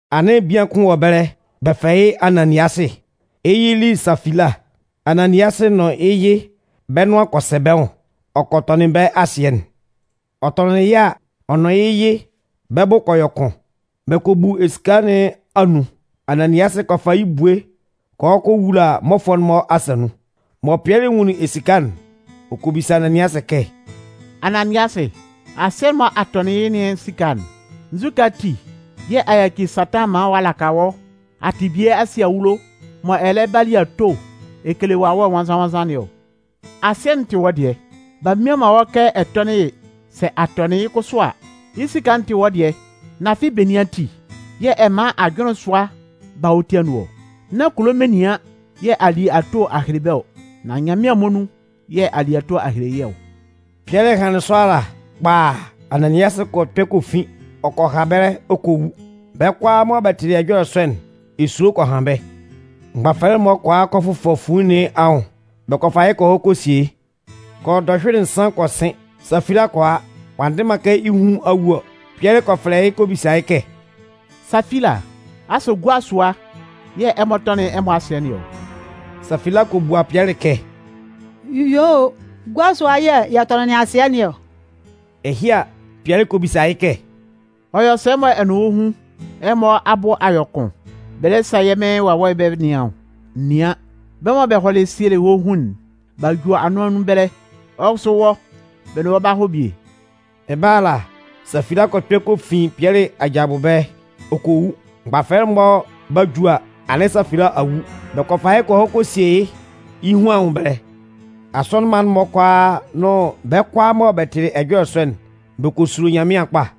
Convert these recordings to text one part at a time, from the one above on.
Anɩn bian kʋn wɔ ɛbɛlɛ, bɛ fɛlɛ yɩ́ Ananiasɩ. Yɩ́ yɩ'n li Safila. Ananiasɩ nʋn yɩ́ yɩ bɛ́ nʋan kɔ sɛ bɛ́ nwʋn, ɔ kɔ tɔnɩn bɛ́ asɩɛ'n. Ɔ tɔnɩnlɩn yɩ́ a, ɔ nʋn yɩ́ yɩ bɛ́ bʋ kɔ yɔ kʋn. Bɛ kɔ bu esika nɩn anun. Ananiasɩ kɔ fa yɩ́ ebue kɔ hɔ kɔ wula mmɔfʋɛ'n-mɔ asa nun. Mɔ Pɩɛlɩ nwunlin esika'n, ɔ kɔ bisa Ananiasɩ kɛ: “Ananiasɩ, asɩɛ'n mɔ a tɔnɩn yɩ́ nɩn esika'n, nzukɛ ati yɛ̂ a yaci Satan maan ɔ'a laka wɔ́ a tɩ bie a sie awulo, mɔ ɛ lɛ ba li ato ɛ kele Wawɛ Nwannzan-nwannzan nɩn ɔ? Asɩɛ'n tɩ wɔ́ dɩɛ, b'a mmian man wɔ́ kɛ ɛ tɔ́nɩn yɩ́. Sɛ a tɔnɩn yɩ́ kʋsʋ a, yɩ́ esika'n tɩ wɔ́ dɩɛ. Nan afɩ benin ati yɛ̂ ɛ man ajʋnlɩn sʋa ba wɔ́ ti anun ɔ? Nán kulo menian yɛ̂ a li ato a hele bɛ́ ɔ, nan Nyanmɩan muonun yɛ̂ a li ato a hele yɩ́ ɔ.” Pɩɛlɩ hanlɩn sɔ ala, kpaaa, Ananiasɩ kɔ kpɛ kɔ fin, ɔ kɔ ha ɛbɛlɛ ɔ kɔ wu. Bɛ́ kʋalaa mɔ bɛ tɩlɩ ɛjɔlɛ sɔ'n, esulo kɔ han bɛ́. Mgbafɛlɛ'n-mɔ kɔ a kɔ fʋfɔ fuin nɩn anwʋn, bɛ kɔ fa yɩ́ kɔ hɔ kɔ sie yɩ́. Kɔ yɔ dɔhyʋɩlɩ nsan kɔ sɩn, Safila kɔ a, ɔ'a ndɩ man kɛ yɩ́ hun a wu ɔ. Pɩɛlɩ kɔ fɛlɛ yɩ́ kɔ bisa yɩ́ kɛ: “Safila, asʋ gua sʋa yɛ̂ ɛmɔ tɔnɩnlɩn ɛmɔ asɩɛ nɩn ɔ?” Safila kɔ bua Pɩɛlɩ kɛ: “Yuo, gua sʋa yɛ̂ yɛ tɔnɩnlɩn asɩɛ nɩn ɔ.” Ɛhɩ a, Pɩɛlɩ kɔ bisa yɩ́ kɛ: “Ɔ yɔ sɛ mɔ ɛ nʋn wɔ́ hun, ɛmɔ abʋ a yɔ kʋn bɛ lɛ sa yɛ́ Mɩn Wawɛ'n bɛ nɩan ɔ? Nɩan, bɛ́ mɔ bɛ hɔlɩ sielɩ wɔ́ hun'n, b'a ju anʋan nun ɛbɛlɛ. Wɔ́ kʋsʋ wɔ́, bɛ nʋn wɔ́ 'ba hɔ bie.” Ɛbɛlɛ ala, Safila kɔ kpɛ kɔ fin Pɩɛlɩ aja abʋ ɛbɛlɛ ɔ kɔ wu. Mgbafɛlɛ'n-mɔ 'ba ju a, anɩn Safila a wu. Bɛ kɔ fa yɩ́ kɔ hɔ kɔ sie yɩ́ yɩ́ hun anwʋn ɛbɛlɛ. Asɔnɩn mma'n-mɔ kʋalaa nʋn bɛ́ kʋalaa mɔ bɛ tɩlɩ ɛjɔlɛ sɔ'n, bɛ kɔ sulo Nyanmɩan kpa.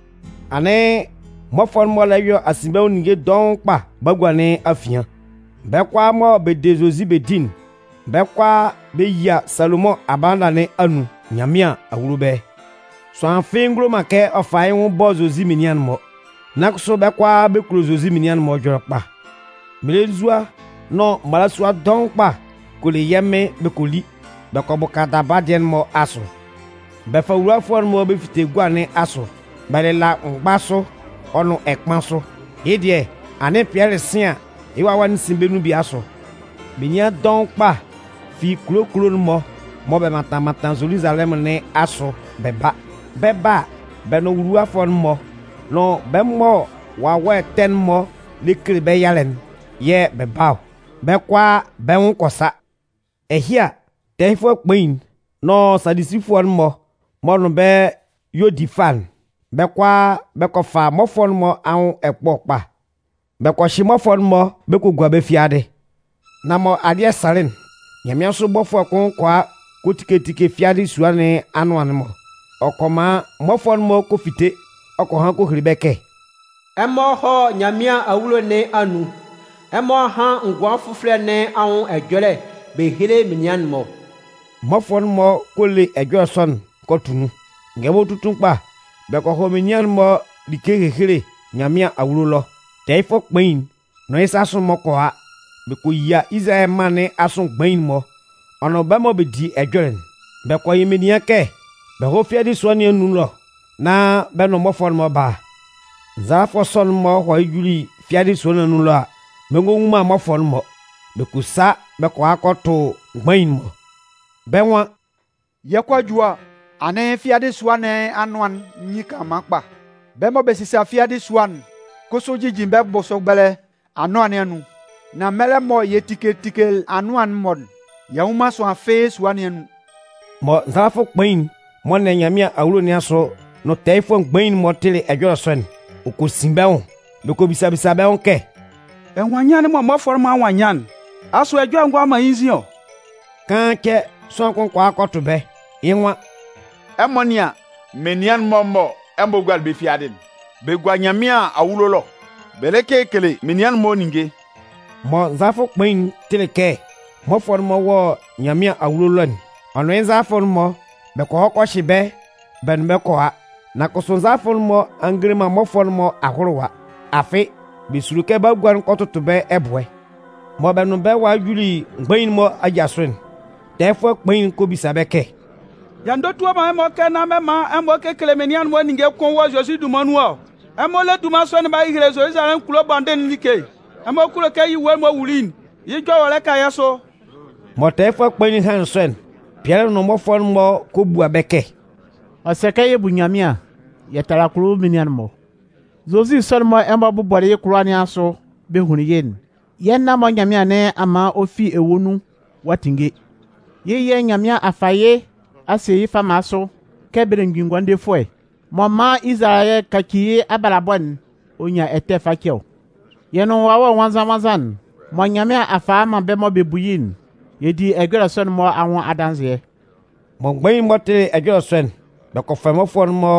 Anɩn mmɔfʋɛ'n-mɔ lɛ yɔ asinbɛnwʋn ninnge dɔʋn kpa bagua nɩn afian. Bɛ́ kʋalaa mɔ bɛ de Zozi bɛ di'n, bɛ́ kʋalaa bɛ yia Salomʋn abalanda nɩn anun Nyanmɩan awulo ɛbɛlɛ. Sʋanlan fɩ́ɩ́ ngulo man kɛ ɔ fa yɩ́ nwʋn ɔ bɔ Zozi menian'n-mɔ. Nan kʋsʋ bɛ́ kʋalaa bɛ kulo Zozi menian'n-mɔ ɛjɔlɛ kpa. Mmelenzua nʋn mmalasua dɔʋn kpa kɔ le yɛ́ Mɩn bɛ kɔ li, bɛ kɔ bʋka daba dɩɛ'n-mɔ asʋ. Bɛ fa nwuluwafʋɛ'n-mɔ bɛ fite gua nɩn asʋ, bɛ lɩla mgba sʋ ɔ nʋn ɛkpan sʋ. Yɩ́ dɩɛ, anɩn Pɩɛlɩ 'sɩn an, yɩ́ wawɛ'n sɩn bɛ́ nun bie asʋ. Menian dɔʋn kpa fi kulo kulo'n-mɔ mɔ bɛ mantan mantan Zoluzalɛmʋn nɩn asʋ bɛ ba. Bɛ 'ba a, bɛ nʋn nwuluwafʋɛ'n-mɔ nʋn bɛ mɔ wawɛ ɛtɛ'n-mɔ lɛ kele bɛ́ yalɛ'n yɛ̂ bɛ ba ɔ. Bɛ́ kʋalaa bɛ́ nwʋn kɔ sa. Ɛhɩ a, tɛɛyɩfʋɛ kpain'n nʋn Sadusifʋɛ'n-mɔ m'ɔ nʋn bɛ́ y'ɔ di fâ'n, bɛ́ kʋalaa bɛ kɔ fa mmɔfʋɛ'n-mɔ anwʋn ɛkpɔ kpa. Bɛ kɔ hyɩ mmɔfʋɛ'n-mɔ bɛ kɔ gua bɛ́ fiadɩ. Nan mɔ alɩ́ɛ sanlɩn'n, nyanmɩansʋ bɔfʋɛ kʋn kɔ a kɔ tike tike fiadɩ sua nɩn anʋan'n-mɔ. Ɔ kɔ man mmɔfʋɛ'n-mɔ kɔ fite, ɔ kɔ han kɔ hele bɛ́ kɛ: “Ɛmɔ hɔ́ Nyanmɩan awulo nɩn anun, ɛmɔ hán ngʋan fʋfɔlɛ nɩn anwʋn ɛjɔlɛ bɛ héle menian'n-mɔ.” Mmɔfʋɛ'n-mɔ kɔ le ɛjɔlɛ sɔ'n kɔ tʋ nun. Ngɛlɛmɔ tutun kpa, bɛ kɔ hɔ menian'n-mɔ like ehehele Nyanmɩan awulo ɛlɔ. Tɛɛyɩfʋɛ kpain'n nʋn yɩ́ sasʋ'n-mɔ kɔ a, bɛ kɔ yia Izalayɛ mân nɩn asʋ mgbain'n-mɔ ɔ nʋn bɛ́ mɔ bɛ di ɛjɔlɛ'n. Bɛ kɔ yɩ menian kɛ bɛ hɔ́ fiadɩ sua nɩn anun ɛlɔ nán bɛ nʋn mmɔfʋɛ'n-mɔ bála. Nzalafʋ sɔ'n-mɔ hɔlɩ juli fiadɩ sua nɩn anun ɛlɔ a, bɛ ngɔ nwun man mmɔfʋɛ'n-mɔ. Bɛ kɔ sa bɛ kɔ a kɔ tʋ mgbain'n-mɔ. Bɛ́ nwan: “Yɛ 'kɔ a ju a, anɩn fiadɩ sua nɩn anʋan'n nyin kanlanman kpa. Bɛ́ mɔ bɛ sisa fiadɩ sua'n kʋsʋ jijin bɛ́ bʋsʋ ɛbɛlɛ anʋan nɩn anun. Nan mɛlɛ mɔ yɛ tikelɩ tikelɩ anʋan'n-mɔ'n, y'a nnwun man sʋanlan fɩ́ɩ́ sua nɩn anun.” Mɔ nzalafʋ kpain'n m'ɔ nɩan Nyanmɩan awulo nɩn asʋ nʋn tɛɛyɩfʋɛ mgbain'n-mɔ tɩlɩ ɛjɔlɛ sɔ'n, ɔ kɔ sin bɛ́ nwʋn. Bɛ kɔ bisa bisa bɛ́ nwʋn kɛ: “Ɛnwannyan'n mɔ mmɔfʋɛ'n-mɔ a nwannyan'n, asʋ ɛjɔlɛ ngɔ a man yɩ́ nzin ɔ?” Kaan cɛ, sʋanlan kʋn kɔ a kɔ tʋ bɛ́. Yɩ́ nwan: “Ɛmɔ nɩ́an, menian'n-mɔ mɔ ɛmɔ gualɩ bɛ́ fiadɩ'n, bɛ gua Nyanmɩan awulo ɛlɔ, bɛ lɛ kekele menian'n-mɔ ninnge.” Mɔ nzalafʋ kpain'n tɩlɩ kɛ mmɔfʋɛ'n-mɔ wɔ Nyanmɩan awulo ɛlɔ'n, ɔ nʋn yɩ́ nzalafʋ'n-mɔ bɛ kɔ hɔ kɔ hyɩ bɛ́ bɛ nʋn bɛ́ kɔ a. Nan kʋsʋ, nzalafʋɛ'n-mɔ a ngele man mmɔfʋɛ'n-mɔ ahʋlʋwa. Afɩ, bɛ sulo kɛ bagua'n kɔ tʋtʋ bɛ́ ɛbʋɛ. Mɔ bɛ nʋn bɛ́ walɩ juli mgbain'n-mɔ aja sʋ'n, tɛɛyɩfʋɛ kpain'n kɔ bisa bɛ́ kɛ: “Y'a ndotua man ɛmɔ kɛ nán man ɛmɔ kekele menian'n-mɔ ninnge kʋ́n wɔ Zozi dunman nun ɔ? Ɛmɔ le dunman sɔ'n b'a hehele Zoluzalɛmʋn kulo bɔndɩn'n like. Ɛmɔ kulo kɛ yɩ́ ewue'n m'ɔ wuli'n, yɩ́ jɔwɔlɛ ka yɛ́ sʋ!” Mɔ tɛɛyɩfʋɛ kpain'n hanlɩn sɔ'n, Pɩɛlɩ nʋn mmɔfʋɛ'n-mɔ kɔ bua bɛ́ kɛ: “Ɔ sɛ kɛ yɛ bú Nyanmɩan yɛ tála kulo menian'n-mɔ. Zozi sɔ'n mɔ ɛmɔ bʋbɔlɩ yɩ́ kʋlʋwa nɩn asʋ bɛ hunlin yɩ́'n, yɛ́ nan-mɔ Nyanmɩan nɩn a man ɔ fi ewue nun ɔ'a tinnge. Yɩ́ yɛ̂ Nyanmɩan a fa yɩ́ a sie yɩ́ fama sʋ kɛ Belemgbin Ngʋandefʋɛ, mɔ ɔ 'man Izalayɛ kaci yɩ́ abalabɔ'n ɔ nyan ɛtɛ face ɔ. Yɛ nʋn Wawɛ Nwannzan-nwannzan'n mɔ Nyanmɩan a fa a man bɛ́ mɔ bɛ bu yɩ́'n, yɛ di ɛjɔlɛ sɔ'n-mɔ anwʋn adanzɩɛ.” Mɔ mgbain'n-mɔ tɩlɩ ɛjɔlɛ sɔ'n, bɛ kɔ fɛ mmɔfʋɛ'n-mɔ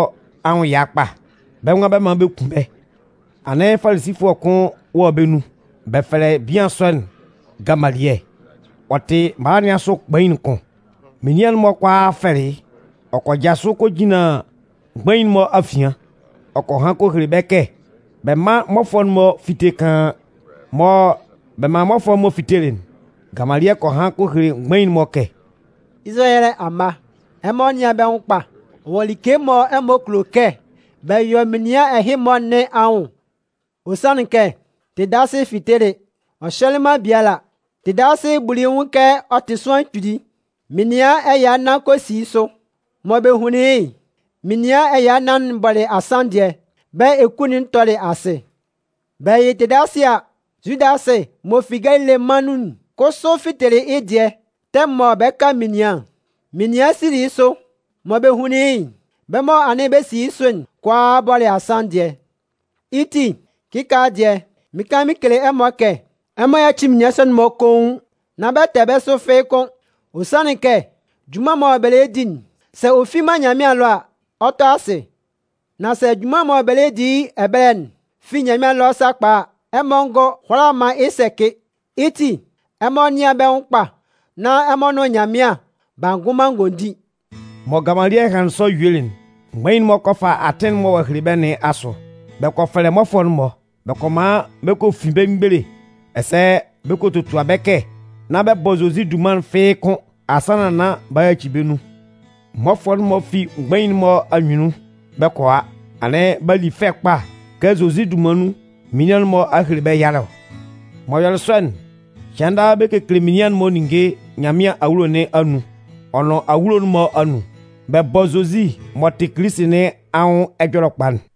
anwʋn ɛya kpa. Bɛ́ nwan bɛ 'man bɛ kun bɛ́. Anɩn Falisifʋɛ kʋn wɔ bɛ́ nun. Bɛ fɛlɛ bian sɔ'n Gamaliɛ. Ɔ tɩ mala nɩn asʋ kpain'n kʋn. Menian'n-mɔ kʋalaa fɛlɩ yɩ́. Ɔ kɔ jasʋ kɔ jinlan mgbain'n-mɔ afian, ɔ kɔ han kɔ hele bɛ́ kɛ bɛ mán mmɔfʋɛ'n-mɔ fíte kaan. Mɔ bɛ manlɩn mmɔfʋɛ'n-mɔ fitelɩ'n, Gamaliɛ kɔ han kɔ hele mgbain'n-mɔ kɛ: “Izalayɛ amma, ɛmɔ nɩ́an bɛ́ nwʋn kpa wɔ like mɔ ɛmɔ kulo kɛ bɛ yɔ menian ɛhɩ-mɔ nɩn anwʋn. Ɔ sanlɩn kɛ, Tedasɩ fitelɩ, ɔ hyɛlɩ man biala. Tedasɩ buli yɩ́ nwʋn kɛ ɔ tɩ sʋanlan kpili. Menian ɛya nnan kɔ si yɩ́ sʋ. Mɔ bɛ hunlin yɩ́'n, menian ɛya nnan'n bɔlɩ asanndɩɛ, bɛ́ eku'n tɔlɩ asɩ. Bɛ yɩ Tedasɩ a, Zudasɩ m'ɔ fi Galile mân nun'n kʋsʋ fitelɩ yɩ́ dɩɛ tɛmʋn mɔ bɛ 'ka menian'n-mɔ'n. Menian sili yɩ́ sʋ. Mɔ bɛ hunlin yɩ́'n, bɛ́ mɔ anɩn bɛ si yɩ́ sʋ'n kʋalaa bɔlɩ asanndɩɛ. Yɩ́ ti, kɩkaala dɩɛ, mɩɩn kan mɩn kele ɛmɔ kɛ ɛmɔ yáci menian sɔ'n-mɔ koun, nán bɛ tɛ bɛ́ sʋ fɩ́ɩ́ kʋ́n. Ɔ sanlɩn kɛ junman'n mɔ bɛ lɛ di'n, sɛ ɔ fi man Nyanmɩan ɛlɔ a, ɔ 'tɔ asɩ. Nan sɛ junman'n mɔ bɛ lɛ di yɩ́ ɛbɛlɛ'n fi Nyanmɩan ɛlɔ sakpa a, ɛmɔ ngɔ hʋala man yɩ́ sɛcɩ. Yɩ́ ti, ɛmɔ nɩ́an bɛ́ nwʋn kpa nán ɛmɔ nʋn Nyanmɩan b'a ngʋn man ngondin!” Mɔ Gamalɩɛ hanlɩn sɔ yuelɩ'n, mgbain'n-mɔ kɔ fa atɩn'n mɔ ɔ'a hele bɛ́ nɩn asʋ. Bɛ kɔ fɛlɛ mmɔfʋɛ'n-mɔ, bɛ kɔ man bɛ kɔ fin bɛ́ mgbele ɛsɛ bɛ kɔ totua bɛ́ kɛ nán bɛ bɔ Zozi dunman'n fɩ́ɩ́ kʋn asannan nán b'a yaci bɛ́ nun. Mmɔfʋɛ'n-mɔ fi mgbain'n-mɔ anyunnun bɛ 'kɔ a, anɩn b'a li fɛ kpa kɛ Zozi dunman nun, menian'n-mɔ a hele bɛ́ yalɛ ɔ. M'ɔ yɔlɩ sɔ'n, cɩan daa bɛ kekele menian'n-mɔ ninnge Nyanmɩan awulo nɩn anun ɔ nʋn awulo'n-mɔ anun, bɛ bɔ Zozi m'ɔ tɩ Kilisi nɩn anwʋn Ɛjɔlɛkpa'n.